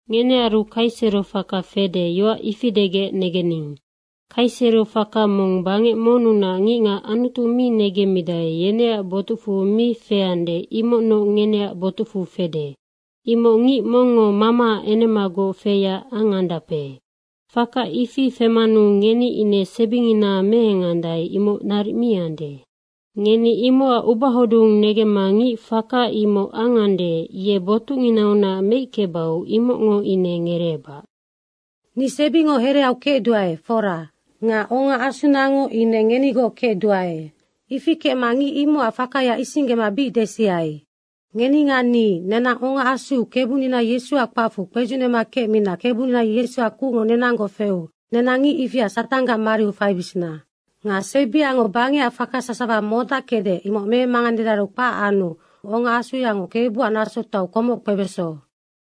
Ngenearu kaisero faka fede, yoac ifi degec negening. Kaisero faka mong bangec monnunac ngicngac Anutu mi negemmidae, yeneac botucfu mi feande, imocnoc ngeneac botucfu fede. Imoc ngic mongngo mamaac enemagoc feyac angandape. Faka ifi femanu ngeni ine sebingina meengandae, imoc naric mi ande. Ngeni imocac ubahodung negemma ngic faka imoc angande, ye botucnginaunac meickebau, imocngo ine ngereebac. Ni sebingo hereau kecduae, fora. Nga ongaasunango ine ngenigoc kecduae. Ifi kecma ngic imocac fakaya isinggema bic desiai. Ngeni nga ni, nenang ongaasuu Kebunina Yesuac kpacfu kpedzucnema kecmina Kebunina Yesuac kucngo nenanggoc feu nenang ngic ifia Satanggac mariu faibisina. Nga sebiango bangecac faka sasawa modackecde, imoc memanganedaru kpac anu ongaasuyango Kebuac nasotoau komoc kpebeso.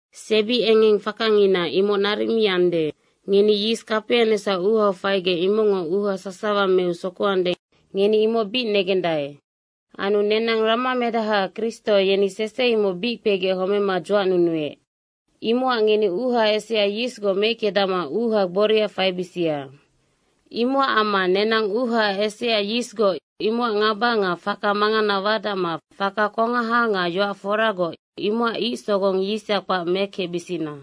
Sebiengengfakangina imoc naric mi ande. Ngeni yis kapianecsac uuhau faigec imocngo uuha sasawa meu sokoande, ngeni imoc bic negendae. Anu nenang ramamedaha Kristo, yeni sese imoc bic kpegec homema dzuacnunuec. Imocac ngeni uuha esea yisgoc meickedacma uuha gboria faibisia. Imocac amma nenang uuha esea yisgoc, imocac ngaba nga faka mangana wadacma faka kongaha nga yoac foragoc, imocac ic sogong yisha kpac mekecbisina.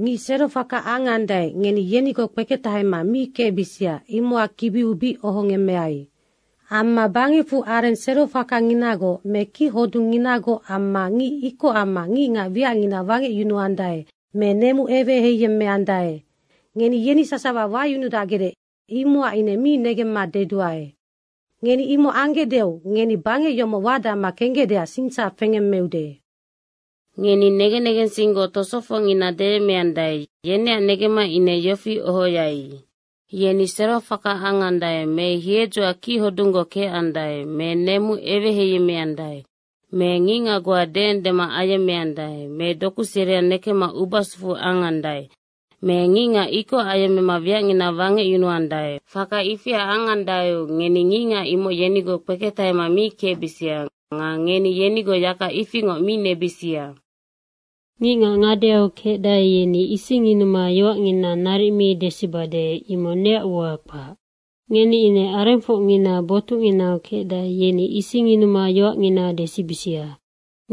Ngic serofaka angandae, ngeni yenigoc kpeketahema mi kecbisia, imocac kibiu bic ohongemmeai. Amma bangecfu areng serofakanginagoc me kichodungnginagoc amma ngic ikoc amma ngicngac wiacngina wangecyunuandae me nemu eweheiyemmeandae, ngeni yeni sasawa wayunudacgecde, imocac ine mi negemma dedua. Ngeni imoc anggecdeu ngeni bangec yomoc wadacma kenggecdeac singsac fengemmeude. Ngeni negen negensinggoc tosofocngina deyemmeandae, yeneac negemma ine yofi ohoai. Yeni serofaka angandae me hiedzoac kichodunggoc kecandae me nemu eweheiyemmeandae me ngicngac goa deendema ayemmeandae me doku seria nekecma ubasufu angandae me ngicngac ikoc ayemmema wiacngina wangecyunuandae, faka ifia angandaeu ngeni ngicngac imoc yenigoc kpeketahema mi kecbisia nga ngeni yenigoc yaka ifingoc mi nebisia. Ngicngac ngadeau kecdae, yeni isingyunuma yoacngina naric mi desibade, imoc neac ua kpac. Ngeni ine arengfocngina botucnginau kecdae, yeni isingyunuma yoacngina desibisia.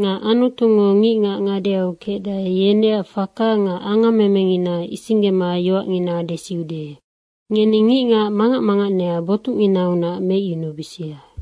Nga Anutungo ngicngac ngadeau kecdae, yeneac faka nga angammemengina isinggema yoacngina desiude. Ngeni ngicngac mangac manganea botucnginaunac meicyunubisia.